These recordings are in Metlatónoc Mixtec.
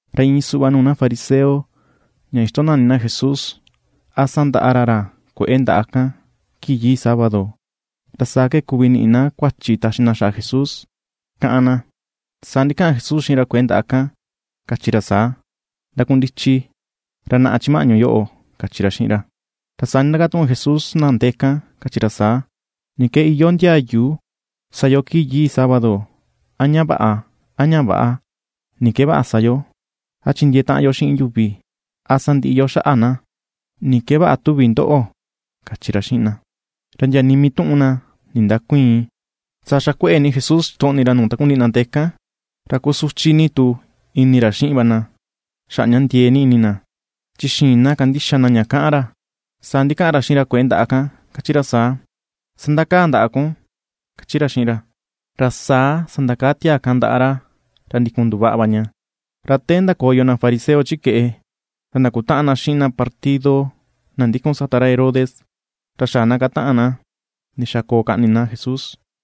Ra iin suꞌva nuu na fariseo ña ixtonani na Jesús, a sandaꞌa ra ra kue̱ꞌe ndaꞌa kan kii yii sábado, ra saa ke kuvi ni̱ꞌi̱ na kuachi taxi na xaꞌa Jesús, kaꞌan na. Saa ndikaꞌan Jesús xiꞌin ra kue̱ꞌe ndaꞌa kan, kachi ra saa: ―Ndakundichi, ra naꞌa chi maꞌñu yoꞌo ―kachi ra xiꞌin ra. Ra saa ndindakatuꞌun Jesús na ndee kan, kachi ra saa: ―¿Ni ke iyoo ndiayu sa yo kii yii: a ña vaꞌa, a ña väꞌa? ¿Ni ke vaꞌa sa yo: a chindiee taꞌan yo xiꞌin yuvi, a sandiꞌi yo xaꞌa na? ¿Ni ke vaꞌa tuvi ndoꞌo? ―kachi ra xiꞌin na. Ra ndia nii mii tuꞌun na ndindäkuiin. Saa xakueꞌe ni Jesús ixtoꞌni ra nuu takundiꞌi na ndee kan, ra kusuchi ni tu ini ra xiꞌin va na xaꞌa ña ndiee ni ini na; chi xïin na kandixa na ña kaꞌan ra. Saa ndikaꞌan ra xiꞌin ra kue̱ꞌe ndaꞌa kan, kachi ra saa: ―Sandakaa ndaꞌa kun ―kachi ra xiꞌin ra. Ra saa sandakaa tiaa kan ndaꞌa ra, ra ndikun nduvaꞌa va ña. Ra te ndakoyo na fariseo chi keꞌe, ra ndakutaꞌan na xiꞌin na partido na ndikun sata ra Herodes ra xaꞌa na kataꞌan na ndixa koo kaꞌni na Jesús.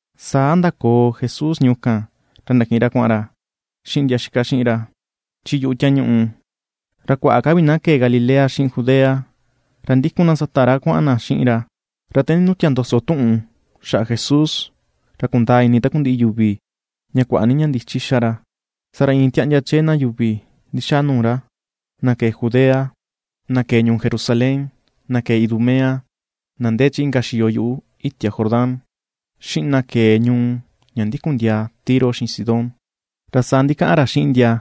Saa ndakoo Jesús ñuu kan, ra ndakiꞌin ra kuaꞌan ra xiꞌin ndia itaꞌan xiꞌin ra chi yuꞌu tiañuꞌu. Ra kuaꞌa ka vi na kee Galilea xiꞌin Judea, ra ndikun na sata ra kuaꞌan na xiꞌin ra. Ra te nindutia ndoso tuꞌun xaꞌa Jesús ra kundaa ini takundiꞌi yuvi ña kuaꞌa ni ña ndichi xa ra, saa ra iin tiaꞌndia chee na yuvi ndixaa nuu ra, na kee Judea, na kee ñuu Jerusalén, na kee Idumea, na ndee chi inka xiyo yuꞌu itia Jordán, xiꞌin na kee ñuu ña ndikun ndiaa Tiro xiꞌin Sidón. Ra saa ndikaꞌan ra xiꞌin ndia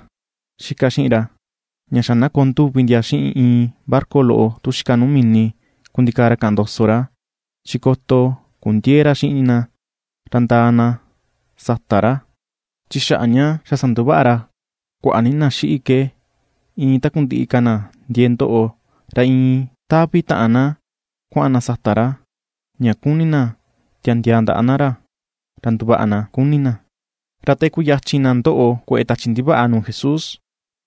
itaꞌan xiꞌin ra, ña xa na koo nduvi ndia xiꞌin iin barca loꞌo, tu xika nuu mini, kundikaa ra kaꞌan ndoso ra, chi koto kundiëe ra xiꞌin na, ra ndaa na sata ra. Chi xaꞌa ña xa sanduvaꞌa ra kuaꞌa ni na xiꞌi ke iin takundiꞌi ka na ndiee ndoꞌo, ra iin taꞌvi taꞌan na kuaꞌan na sata ra, ña kuni na tiandiaa ndaꞌa na ra, ra nduvaꞌa na kuni na. Ra te kuyachin na ndoꞌo kueꞌe tachi ndivaꞌa nuu Jesús,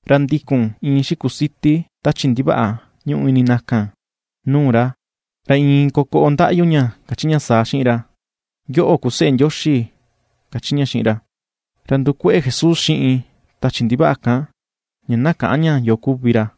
ra ndikun iin xikusiti tachi ndivaꞌa ñuꞌu ini na kan nuu ra. Ra iin kokoꞌo ndaꞌyu ña kachi ña saa xiꞌin ra: ―Yoꞌo ku seꞌe Ndioxi ―kachi ña xiꞌin ra. Ra ndukueꞌe Jesús xiꞌin tachi ndivaꞌa kan, ña na käꞌan ña yo kuvi ra.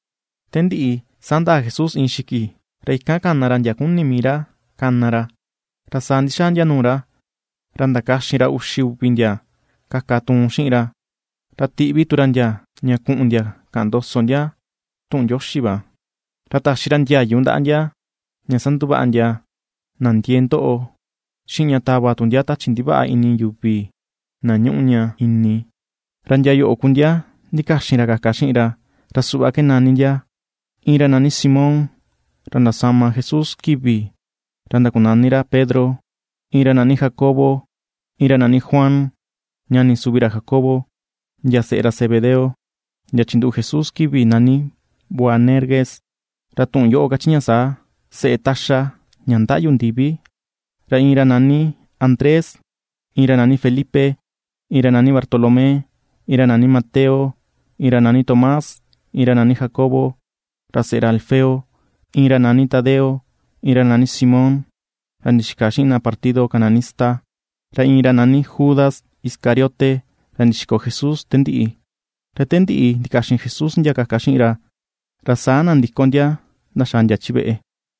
Te ndiꞌi, saa ndaa Jesús iin xiki. Ra ikan kana ra ndia kuni mii ra kana ra, ra saa ndixaa ndia nuu ra. Ra ndakaxin ra uxi uvi ndia kaka tuun xiꞌin ra, ra tiꞌvi tu ra ndia ña kuꞌun ndia kaꞌan ndoso ndia tuꞌun Ndioxi va. Ra taxi ra ndiayu ndaꞌa ndia ña sanduvaꞌa ndia na ndiee ndoꞌo, xiꞌin ña tava tu ndia tachi ndivaꞌa ini yuvi na ñuꞌu ña ini. Ra ndia yoꞌo ku ndia ndikaxin ra kaka xiꞌin ra, ra suꞌva ke nani ndia: Iin ra nani Simón, ra ndasama Jesús kivi ra ndakunani ra Pedro, iin ra nani Jacobo, iin ra nani Juan, ñani suvi ra Jacobo, ndia seꞌe ra Zebedeo, ndia chinduꞌu Jesús kivi nani Boanerges, ra tuꞌun yoꞌo kachi ña saa: Seꞌe taxa ña ndaꞌyu ndivi; ra iin ra nani Andrés, iin ra nani Felipe, iin ra nani Bartolomé, iin ra nani Mateo, iin ra nani Tomás, iin ra nani Jacobo, ra seꞌe ra Alfeo; iin ra nani Tadeo, iin ra nani Simón ra ndixika xiꞌin na partido Cananista, ra iin ra nani Judas Iscariote, ra ndixiko Jesús te ndiꞌi. Ra te ndiꞌi ndikaxin Jesús ndia kaka xiꞌin ra, ra saa nandiko ndia ndaxaa ndia chi veꞌe.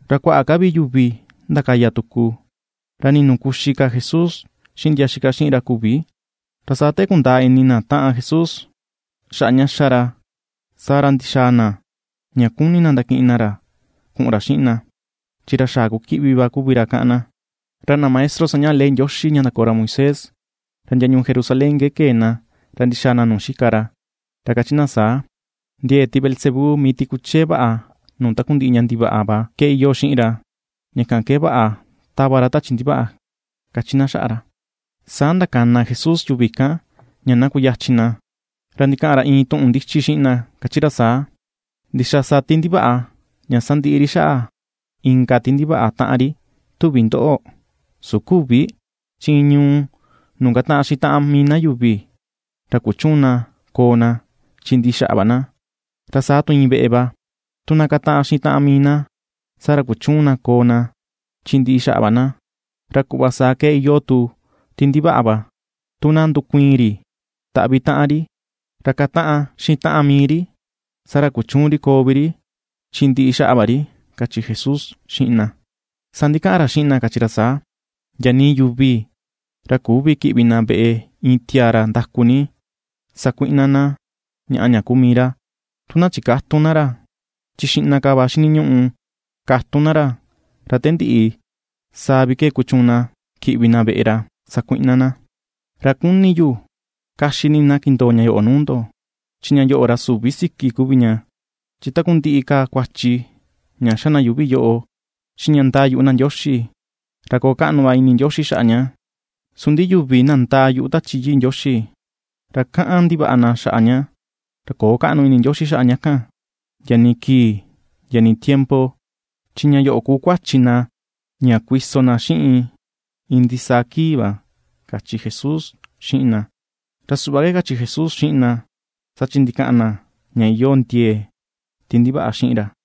Ra kuaꞌa ka vi yuvi ndakaya tuku, ra nii nuu kuxi ka Jesús xiꞌin ndia itaꞌan xiꞌin ra küvi. Ra saa te kundaa ini na taꞌan Jesús xaꞌa ña xa ra, saa ra, ndixaa na ña kuni na ndakiꞌin na ra kuꞌun ra xiꞌin na, chi ra xaꞌa kukiꞌvi va kuvi ra kaꞌan na. Ra na maestro sañaꞌa ley Ndioxi ña ndakoo ra Moisés, ra ndia ñuu Jerusalén ke kee na ra ndixaa na nuu xika ra, ra kachi na saa: ―Ndie̱e̱ ti Beelzebú, mii ti kuchee vaꞌa nuu takundiꞌi ña ndivaꞌa va, ke iyoo xiꞌin ra, ña kan ke vaꞌa tava ra tachi ndivaꞌa ―kachi na xaꞌa ra. Saa ndakana Jesús yuvi kan ña na kuyachin na. Ra ndikaꞌan ra iin tuꞌun ndichi xiꞌin na kachi ra saa: ―¿Ndixa sa ti ndivaꞌa ña sandiꞌi ri xaꞌa inka ti ndivaꞌa taꞌan ri, tuvi ndoꞌo? Su küvi. Chi iin ñuu nuu kataꞌan xiꞌin taꞌan mii na yuvi, ra kuchüun na ña koo na, chi ndiꞌi xaꞌa va na. Ra saa tu iin veꞌe va. Tu na kataꞌan xiꞌin taꞌan mii na, saa ra kuchüun na koo na chi ndiꞌi xaꞌa va na. Ra kuꞌva saa ke iyoo tu ti ndivaꞌa va. Tu na ndukuiin ri taꞌvi taꞌan ri, ra kataꞌan xiꞌin taꞌan mii ri, saa ra kuchüun ri koo vi ri, chin ndiꞌi xaꞌa va ri ―kachi Jesús xiꞌin na. Saa ndikaꞌan ra xiꞌin na kachi ra saa: ―Ndia nii yuvi ra küvi kiꞌvi na veꞌe iin tiaa ra ndaku ni sakuiꞌna na ñaꞌa ña kuu mii ra, tu na chikätun na ra; chi xiꞌna ka va xiniñuꞌu katun na ra, ra te ndiꞌi, saa vi ke kuchuun na kiꞌvi na veꞌe ra sakuiꞌna na. ’Ra kuni yu kaxi ni na kindoo ña yoꞌo nuu ndo, chi ña yoꞌo ra süvi siki kuvi ña: chi takundiꞌi ka kuachi ña xa na yuvi yoꞌo, xiꞌin ña ndaa yuꞌu na Ndioxi, ra koo kaꞌnu va ini Ndioxi xaꞌa ña. Su ndi yuvi na ndaa yuꞌu tu Tachi Yii Ndioxi, ra kaꞌan ndivaꞌa na xaꞌa ña, ra köo kaꞌnu ini Ndioxi xaꞌa na kan, ndia nii kii, ndia nii tiempo, chi ña yoꞌo kuu kuachi na ña kuiso na xiꞌin iin ndisaa kii va ―kachi Jesús xiꞌin na. Ra suꞌva ke kachi Jesús xiꞌin na, saa chi ndikaꞌan na ña iyoo ndie̱e̱ ti ndivaꞌa xiꞌin ra.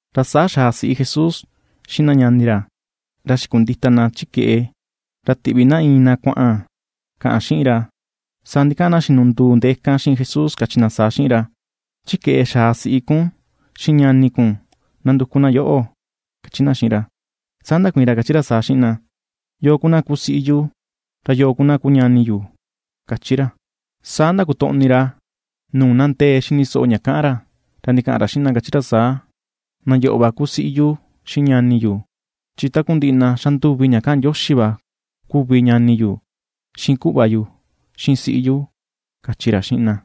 Ra saa xaa siꞌi Jesús, xiꞌin na ñani ra. Ra xikundita na chi keꞌe, ra tiꞌvi na iin na kuaꞌan kaꞌan xiꞌin ra. Saa ndikaꞌan na xinunduu ndee kan xiꞌin Jesús, kachi na saa xiꞌin ra: ―Chi keꞌe xaa siꞌi kun xiꞌin ñani kun nanduku na yoꞌo ―kachi na xiꞌin ra. Saa ndakuiin ra kachi ra saa xiꞌin na: ―¿Yoo ku na kuu siꞌi yu, ra yo ku na kuu ñani yu? ―kachi ra. Saa ndakotoꞌni ra nuu na ndee xini soꞌo ña kaꞌan ra, ra ndikaꞌan ra xiꞌin na, kachi ra saa: ―Na yoꞌo va ku siꞌi yu xiꞌin ñani yu. Chi takundiꞌi na xanduvi ña kaꞌan Ndioxi va kuvi ñani yu, xiꞌin kuꞌva yu, xiꞌin siꞌi yu ―kachi ra xiꞌin na.